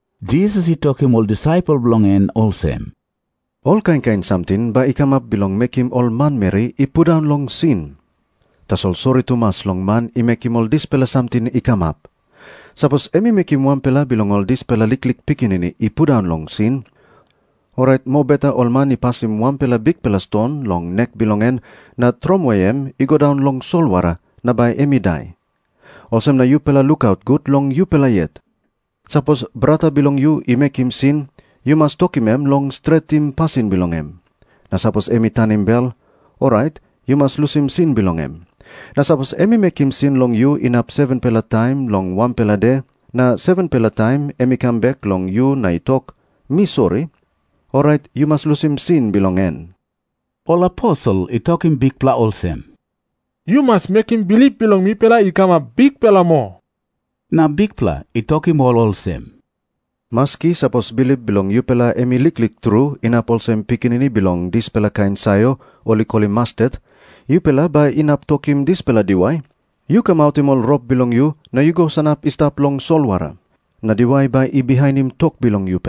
Jisas i tokim ol disaipel bilong en olsem, “Ol kain kain samting bai i kamap bilong mekim ol manmeri i pundaun long sin. Tasol sori tumas long man i mekim ol dispela samting i kamap. Sapos em i mekim wanpela bilong ol dispela liklik pikinini i pundaun long sin, orait mobeta ol man i pasim wanpela bikpela ston long nek bilong em na tromoi em i go daun long solwara na bai em i dai. Olsem na yupela lukaut gut long yupela yet. “Sapos brata bilong yu i mekim sin, yu mas tokim em long stretim pasin bilong em. Na sapos em i tanim bel, orait yu mas lusim sin bilong em. Na sapos em i mekim sin long yu inap 7-pela taim long wanpela de, na 7-pela taim em i kam bek long yu na i tok, ‘Mi sori,’ orait yu mas lusim sin bilong en.” Ol aposel i tokim Bikpela olsem, “Yu mas mekim bilip bilong mipela i kamap bikpela moa.” Na Bikpela i tokim ol olsem, “Maski sapos bilip bilong yupela em i liklik tru inap olsem pikinini bilong dispela kain sayor ol i kolim mastet, yupela bai inap tokim dispela diwai, ‘Yu kamautim ol rop bilong yu na yu go sanap i stap long solwara,’ na diwai bai i bihainim tok bilong yupela.”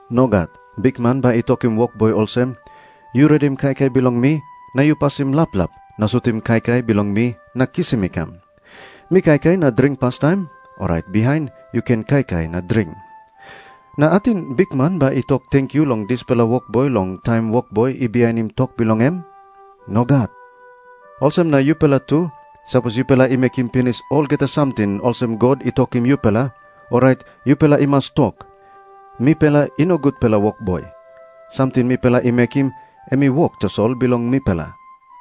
Nogat. Bikman bai i tokim wokboi olsem, ‘Yu redim kaikai bilong mi, na yu pasim laplap na sutim kaikai bilong mi na kisim i kam. Mi kaikai na dring pastaim, orait bihain yu ken kaikai na dring.’ Na ating bikman bai i tok tenkyu long dispela wokboi long taim wokboi i bihainim tok bilong em? Nogat. Olsem na yupela tu, sapos yupela i mekim pinis olgeta samting olsem God i tokim yupela, orait yupela i mas tok, ‘Mipela i no gutpela wokboi. Samting mipela i mekim, em i wok tasol bilong mipela.’”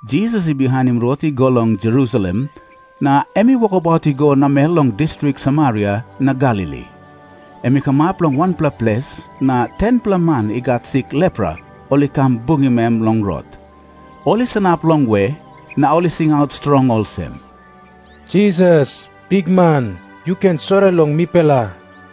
Jisas i bihainim rot i go long Jerusalem, na em i wokabaut i go namel long distrik Samaria na Galili. Em i kamap long wanpela ples, na 10-pela man i gat sik lepra ol i kam bungim em long rot. Ol i sanap longwe, na ol i singaut strong olsem, “Jisas, bikman, yu ken sori long mipela.”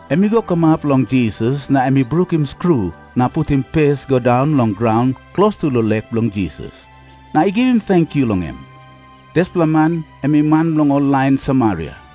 Em i go kamap long Jisas na em i brukim skru na putim pes i go daun long graun klostu long lek bilong Jisas, na i givim tenkyu long em. Dispela man em i man bilong ol lain Samaria.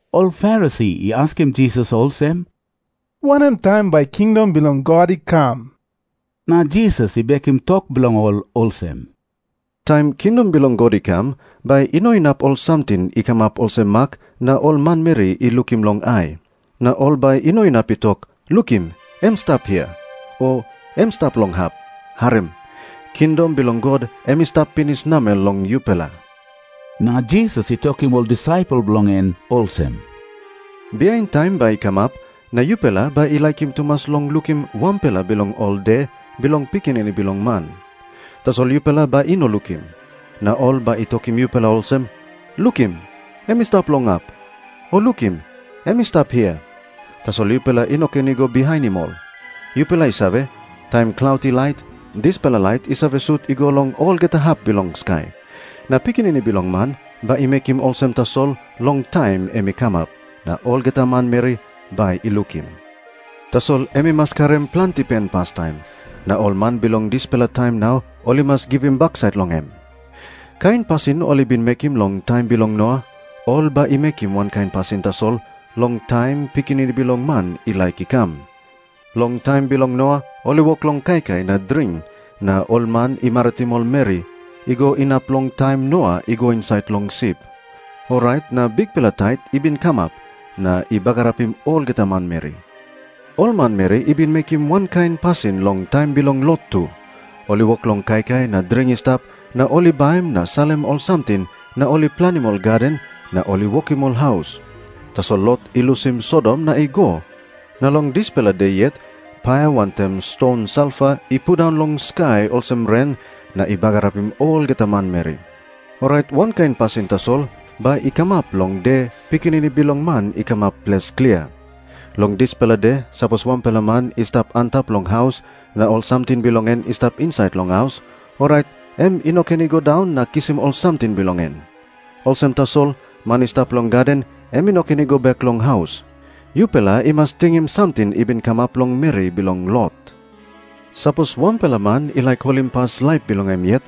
Ol Farisi i askim Jisas olsem, “Wanem taim bai kingdom bilong God i kam?” Na Jisas i bekim tok bilong ol olsem, “Taim kingdom bilong God i kam, bai i no inap ol samting i kamap olsem mak na ol manmeri i lukim long ai. Na ol bai i no inap i tok, ‘Lukim, em i stap hia,’ o ‘Em i stap long hap.’ Harim. Kingdom bilong God em i stap pinis namel long yupela.” Na Jisas i tokim ol disaipel bilong en olsem, “Bihain taim bai i kamap, na yupela bai i laikim tumas long lukim wanpela bilong ol de bilong Pikinini Bilong Man. Tasol yupela bai i no lukim. Na ol bai i tokim yupela olsem, ‘Lukim, em i stap long hap,’ o ‘Lukim, em i stap hia.’ Tasol yupela i no ken i go bihainim ol. Yupela i save, taim klaut i lait, dispela lait i save sut i go long olgeta hap bilong skai. Na Pikinini Bilong Man bai i mekim olsem tasol long taim em i kamap, na olgeta manmeri bai i lukim. Tasol em i mas karim planti pen pastaim, na ol man bilong dispela taim nau ol i mas givim baksait long em. “Kain pasin ol i bin mekim long taim bilong Noa, ol bai i mekim wankain pasin tasol long taim Pikinini Bilong Man i laik i kam. Long taim bilong Noa ol i wok long kaikai na dring, na ol man i maritim ol meri, i go inap long taim Noa i go insait long sip. Orait na bikpela tait i bin kamap, na i bagarapim olgeta manmeri. Ol manmeri i bin mekim wankain pasin long taim bilong Lot tu. Ol i wok long kaikai na dring i stap na ol i baim na salim ol samting na ol i planim ol gaden na ol i wokim ol haus. Tasol Lot i lusim Sodom na i go, na long dispela de yet paia wantaim ston salfa i pundaun long skai olsem ren, na i bagarapim olgeta manmeri. Orait wankain pasin tasol bai i kamap long de Pikinini Bilong Man i kamap ples klia. “Long dispela de sapos wanpela man i stap antap long haus, na ol samting bilong en i stap insait long haus, orait em i no ken i go daun na kisim ol samting bilong en. Olsem tasol, man i stap long gaden, em i no ken i go bek long haus. Yupela i mas tingim samting i bin kamap long meri bilong Lot. Sapos wanpela man i laik holimpas laip bilong em yet,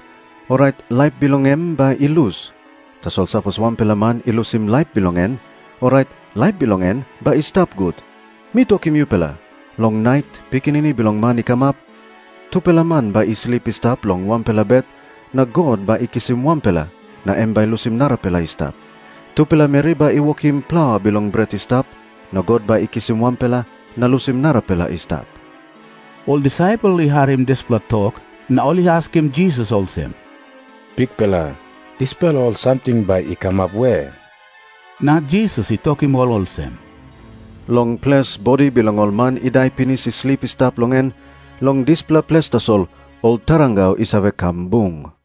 orait laip bilong em bai i lus. Tasol sapos wanpela man i lusim laip bilong en, orait laip bilong en bai i stap gut. “Mi tokim yupela, long nait Pikinini Bilong Man i kamap, tupela man bai i slip i stap long wanpela bet, na God bai i kisim anpela, na em bai i lusim narapela i stap. Tupela meri bai i wokim plaua bilong bret i stap, na God bai i kisim wanpela, na lusim narapela i stap.” Ol disaipel i harim dispela tok na ol i askim Jisas olsem, “Bikpela, dispela ol samting bai i kamap we?” Na Jisas i tokim ol olsem, “Long ples bodi bilong ol man i dai pinis i slip i stap long en, long dispela ples tasol ol tarangau i save kam bung.”